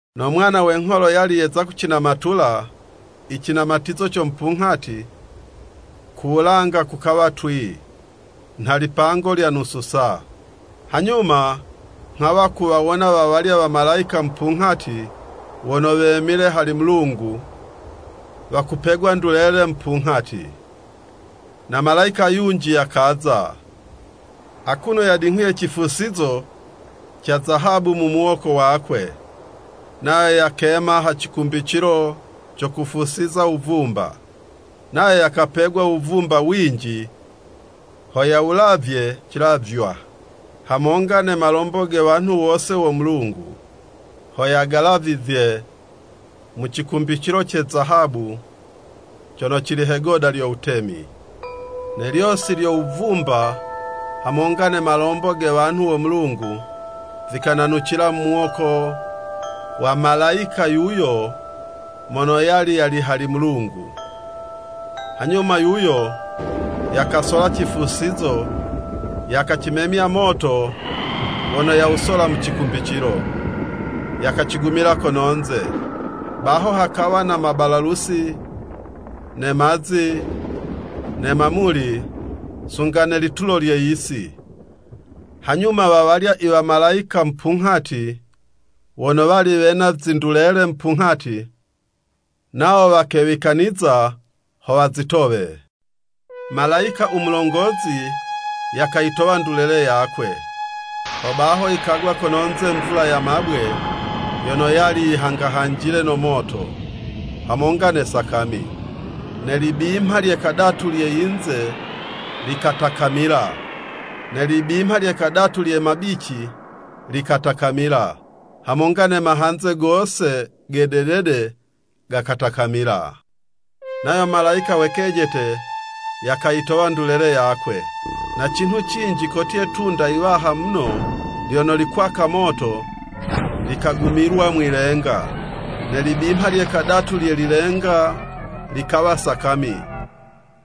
No Mwana we ngholo yali yeza kucinamatula i cinamatizo co mupunghati, ku wulanga kukawa twii, nha lipango lya nusu saa. Hanyuma nghawa kuwawona wa walya wamalayika mupunghati wono wemile hali Mulungu wakupegwa ndulele mupunghati. Na malayika yunji yakaza, akuno yadinghuye cifusizo ca zahabu mu muwoko wakwe, nayo yakema ha cikumbicilo co kufusiza wuvumba. Nayo yakapegwa wuvumba winji ho yawulavye cilavywa hamonga ne malombo ge wanhu wose wo Mulungu, ho yagalavizye mu cikumbicilo ce zahabu cono cili he'goda lyo wutemi. Ne lyosi lyo wuvumba hamonga ne malombo ge wanhu wo Mulungu, vikananucila mu muwoko wa malayika yuyo mono yali yali hali Mulungu. Hanyuma yuyo, yakasola cifusizo, yakacimemya moto wono yawusola mu cikumbicilo, yakacigumila kono'nze. Baho hakawa na mabalalusi, ne mazi, ne mamuli, sunga ne litulo lye yisi. Hanyuma wa walya i wamalayika mupunghati wono wali wena zindulele mupunghati, nawo wakewikaniza ho wazitowe. Malayika u mulongozi yakayitowa ndulele yakwe. Hobaho yikagwa kono'nze mvula ya mabwe, yono yali yihangahanjile no moto, hamonga ne sakami. Ne libimha lye kadatu lye yinze likatakamila, ne libimha lye kadatu lye mabici likatakamila, hamonga ne mahanze gose ge dedede gakatakamila. Nayo malayika we kejete yakayitowa ndulele yakwe. Na cinhu cinji kotye 'tunda yiwaha muno lyono likwaka moto, likagumilwa mwi'lenga. Ne libimha lye kadatu lye lilenga likawa sakami,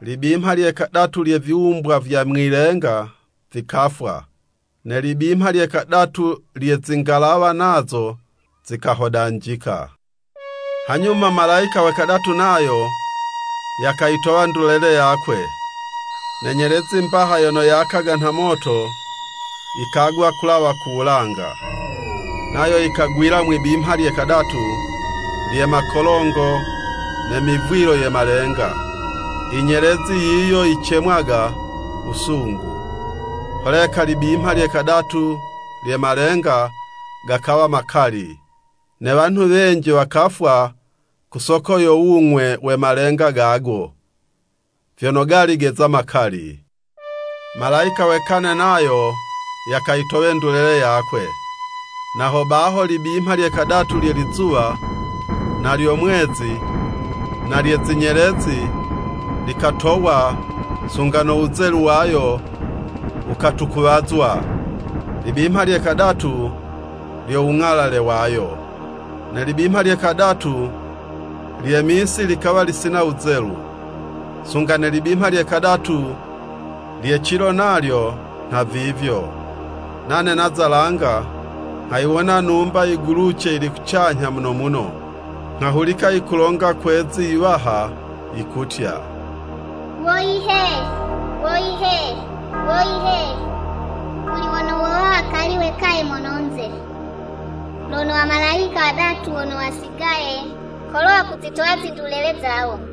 libimha lye kadatu lye viwumbwa vya mwi'lenga vikafwa, ne libimha lye kadatu lye zingalawa, nazo zikahodanjika. Hanyuma malayika we kadatu nayo, yakayitowa ndulele yakwe. Ne nyelezi mbaha yono yakaga nha moto, yikagwa kulawa ku wulanga, nayo yikagwila mwi'bimha lye kadatu lye makolongo ne mivwilo ye malenga. (Inyelezi yiyo yicemwaga “Wusungu.”) Holeka libimha lye kadatu lye malenga, gakawa makali, ne wanhu wenji wakafwa ku soko yo wung'we we malenga gago, vyono gali geza makali. Malayika we kane nayo yakayitowe ndulele yakwe. Na hobaho libimha lye kadatu lye lizuwa, na lyo mwezi, na lye zinyelezi likatowa, sunga no wuzelu wayo, wukatukuwazwa libimha lye kadatu lyo wung'alale wayo. Ne libimha lye kadatu lye misi likawa lisina wuzelu, sunga ne libimha lye kadatu lye cilo, nalyo nhavivyo. Nane naza langa, nghayiwona numba yiguluce yili kucanyha muno muno, nghahulika yikulonga kwe'zi iwaha yikutya, “Woyi he, woyi he, woyi he, kuli wono wowa wakali wekaye mono'nze, lono wamalayika wadatu wono wasigaye kolo wakuzitowa zindulele zawo!”